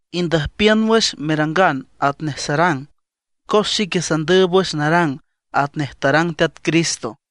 Indüjpiün wüx merangan atnej sarang, cos xique sandüüb wüx narang atnej tarang Teat Cristo.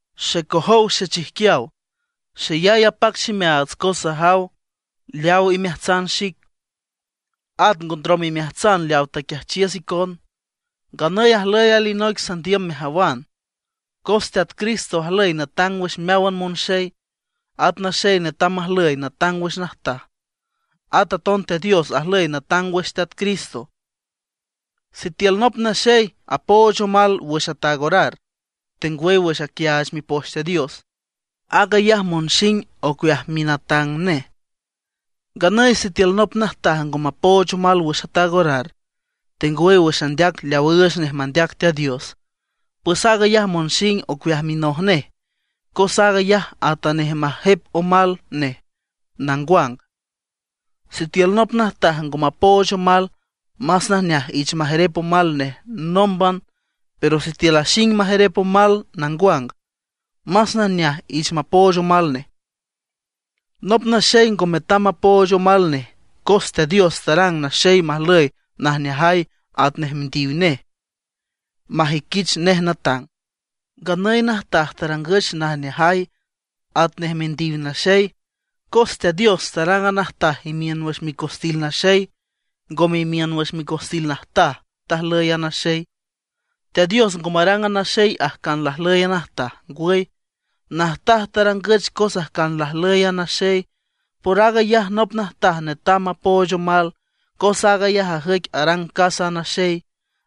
Xecojow xechijquiaw, xeyay apac ximeaats cos sajaw leaaw imeajtsan xic, at ngo ndrom imeajtsan leaw taquiajchiüs icon. Nganüy ajlüy alinoic sandiüm mejawan: Cos Teat Cristo ajlüy natang wüx meáwan monxey, at naxey netam majlüy natang wüx najtaj, at aton Teat Dios ajlüy natang wüx Teat Cristo. Sitiül nop naxey apooch omal wüx ataag orar, tengwüy wüx aquiaach Mipoch Teat Dios, aag ayaj monxing ocueaj minatang nej. Nganüy sitiül nop najtaj ngo mapooch omal wüx ataag orar tengwüy wüx andeac leaw üüch nej mandeac Teat Dios, pues aag ayaj monxing ocueaj minoj nej, cos aag ayaj atanej majep omal nej nangwang. Sitiül nop najtaj ngo mapooch omal, más najneaj ich majerep omal nej nómban. Pero sitiül axing majerep omal nangwang, más najneaj ich mapooch omal nej. Nop naxey ngo metam mapooch omal nej, cos Teat Dios tarang naxey majlüy najneajay atnej mindiw nej, majüiquich nej natang. Nganüy najtaj tarangüch najneajay atnej mindiw naxey. Cos Teat Dios tarang a najtaj imiün wüx micostil naxey, ngome imiün wüx micostil najtaj tajlüy naxey. Teat Dios ngo marang a naxey ajcan lajlüy a najtaj; ngwüy, najtaj tarangüch cos ajcan lajlüy a naxey. Por aag ayaj nop najtaj netam mapooch omal, cos aag ayaj ajüic arang casa naxey,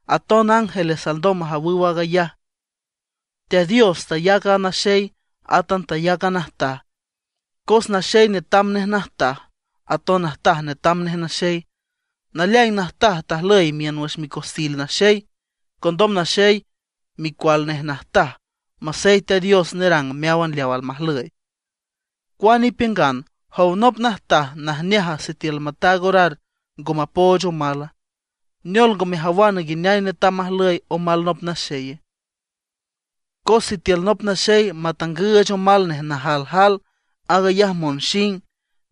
aton ángeles alndom majawüw aag ayaj. Teat Dios tayac a naxey, átan tayac a najtaj, cos naxey netam nej najtaj, aton najtaj netam nej naxey. Naleaing najtaj tajlüy imiün wüx micostil naxey, condom naxey micual nej najtaj, masey Teat Dios nerang meáwan leaw almajlüy. Cuane ipiüngan, ¿jow nop najtaj, najneaja sitiül mataag orar ngo mapooch omala? ¿Neol ngo mejawana nguineay netam majlüy omal nop naxeye? Cos sitiül nop naxey matangüüch omal nej najaljal, aag ayaj monxing.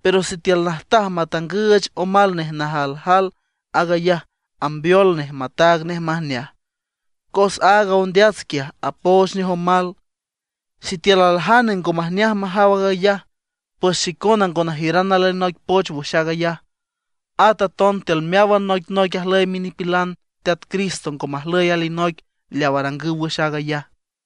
Pero sitiül najtaj matangüüch omal nej najaljal aag ayaj ambeol nej mataag nej majneaj, cos aaga ondeats quiaj apooch nej omal. Sitiül aljane ngo majneaj majaw aag ayaj, pues xicona ngo najiüran alinoic poch wüx aag ayaj. At aton tiül meáwan noicnoic ajlüy minipilan Teat Cristo ngo majlüy alinoic leaw arangüw wüx aag ayaj.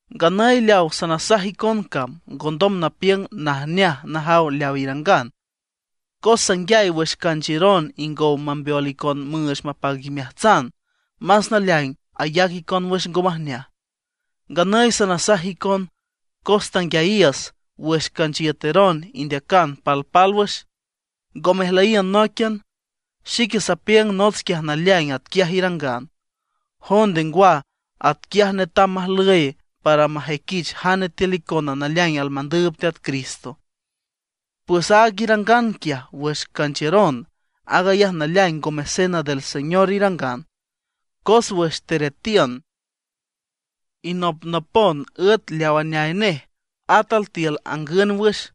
Nganüy leaw sanasaj icon cam, ngondom napiüng najneaj najaw leaw irangan. Cos sanguiay wüx canchiüron ingow mambeol icon müüch mapac imeajtsan, más naleaing ayac icon wüx ngo majneaj. Nganüy sanasaj icon, cos tanguiayiüs wüx canchiüteron indeacan palpálwüx, ngo mejlüyiün nóiquian. Xique sapiüng nots quiaj naleaing atquiaj irangan. Jonde ngwa, atquiaj netam majlüy para majüiquich jane tiül icona naleaing almandüüb Teat Cristo. Pues aag irangan quiaj wüx canchiüron, aag ayaj naleaing ngome Cena del Señor irangan. Cos wüx teretiün, inopnopon üet leaw aneay nej, at altiül angün wüx.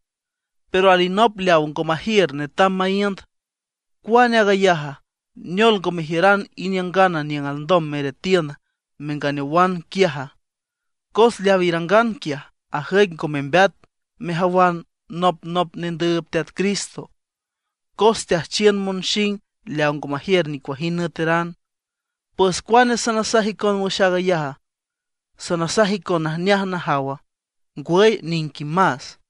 Pero alinop leaw ngo majiür netam maíünd. ¿Cuane aag ayaja? ¿Neol, ngo mejiüran iniüngana niüng alndom meretiün, menganeowan quiaja? Cos leaw irangan quiaj, ajüic ngo membeat mejawan nopnop nendüüb Teat Cristo, cos teajchiün monxing leaw ngo majiür nicuajind nüeteran. ¿Pues cuane sanasaj icon wüx aag ayaja? ¿Sanasaj icon najneaj najawa? ¡Ngwüy niquimas!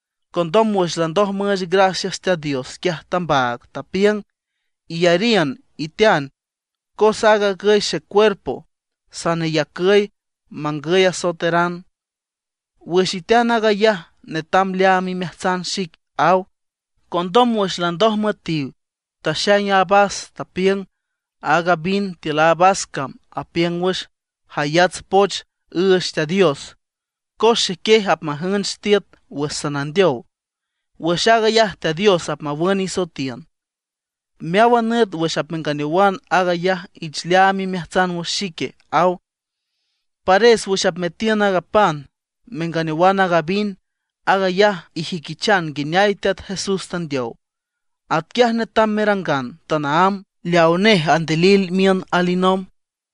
Condom wüx landoj müüch gracias Teat Dios, quiaj tambaag. Tapiüng: “Iyariün, itean, cos aag agüy xecuerpo, saneyacüy mangüy asoeteran. Wüx itean aag ayaj netam leaam imeajtsan xic”, aw. Condom wüx landoj müetiw, taxaing a vas, tapiüng: “Aaga vin tiül a vas cam apiüng wüx jayats poch üüch Teat Dios, cos xequiej apmajünch tiüt wüx sanandeow. Wüx aag ayaj Teat Dios apmawün isoetiün. Meáwan nüt wüx apmenganeowan aag ayaj ich leaam imeajtsan wüx xique”, aw. Pares wüx apmetiün aaga pan, menganeowan aaga vin, aag ayaj ijüiquichan nguineay Teat Jesús tandeow. Atquiay netam merangan tanaámb, leaw nej andilil miün alinomb.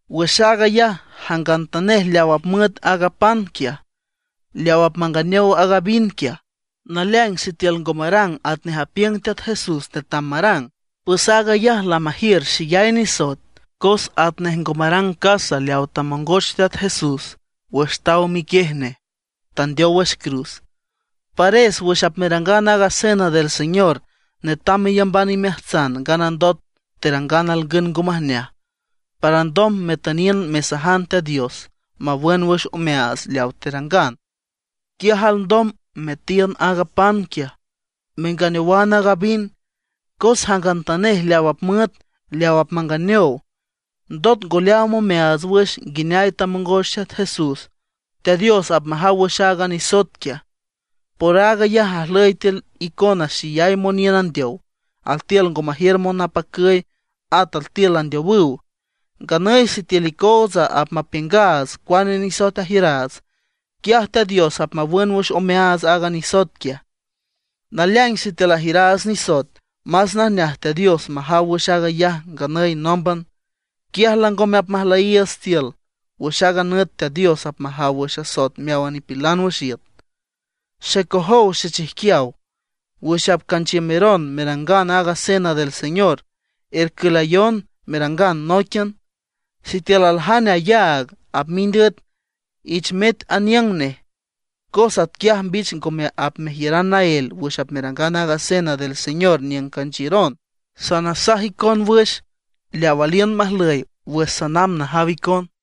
Wüx aag ayaj, jangantanej leaw apmüet aaga pan quiaj, leaw apmanganeow aaga vin quiaj, naleaing sitiül ngo marang atnej apiüng Teat Jesús netam marang, pues aag ayaj lamajiür xeyay nisoet, cos atnej ngo marang casa leaw tamongoch Teat Jesús wüx taw miquiej nej, tandeow wüx cruz. Pares wüx apmerangan aaga Cena del Señor netam meyamban imeajtsan nganandot terangan alngün ngo majneaj, para alndom metüniün mesajan Teat Dios mawün wüx omeaats leaw terangan. Quiaj alndom metiün aaga pan quiaj, menganeowan aaga vin. Cos jangantanej leaw apmüet, leaw apmanganeow, ndot ngo leaam omeaats wüx nguineay tamongoch Teat Jesús, Teat Dios apmajaw wüx aaga nisoet quiaj. Por aag ayaj ajlüy tiül icona xeyay moniün andeow, altiül ngo majiür monapacüy, at altiül landeowüw. Nganüy sitiül icootsa apmapiüngaats cuane nisoet ajiüraats, quiaj Teat Dios apmawün wüx omeaats aaga nisoet quiaj. Naleaing sitiül ajiüraats nisoet, más najneaj Teat Dios majaw wüx aag ayaj nganüy nómban, quiaj langome apmajlüyiiüts tiül, wüx aaga nüt Teat Dios apmajaw wüx asoet meáwan nipilan wüx iüt. Xecojow xechijquiaw, wüx apcanchiümeron merangan aaga Cena del Señor, ercülayon merangan nóiquian. Sitiül aljane ayáagan apmind üet, ich met aniüng nej, cos atquiaj mbich ngome apmejiüran naél wüx apmerangan aaga Cena del Señor niüng canchiüron. Sanasaj icon wüx leaw aliün majlüy wüx sanamb najaw icon.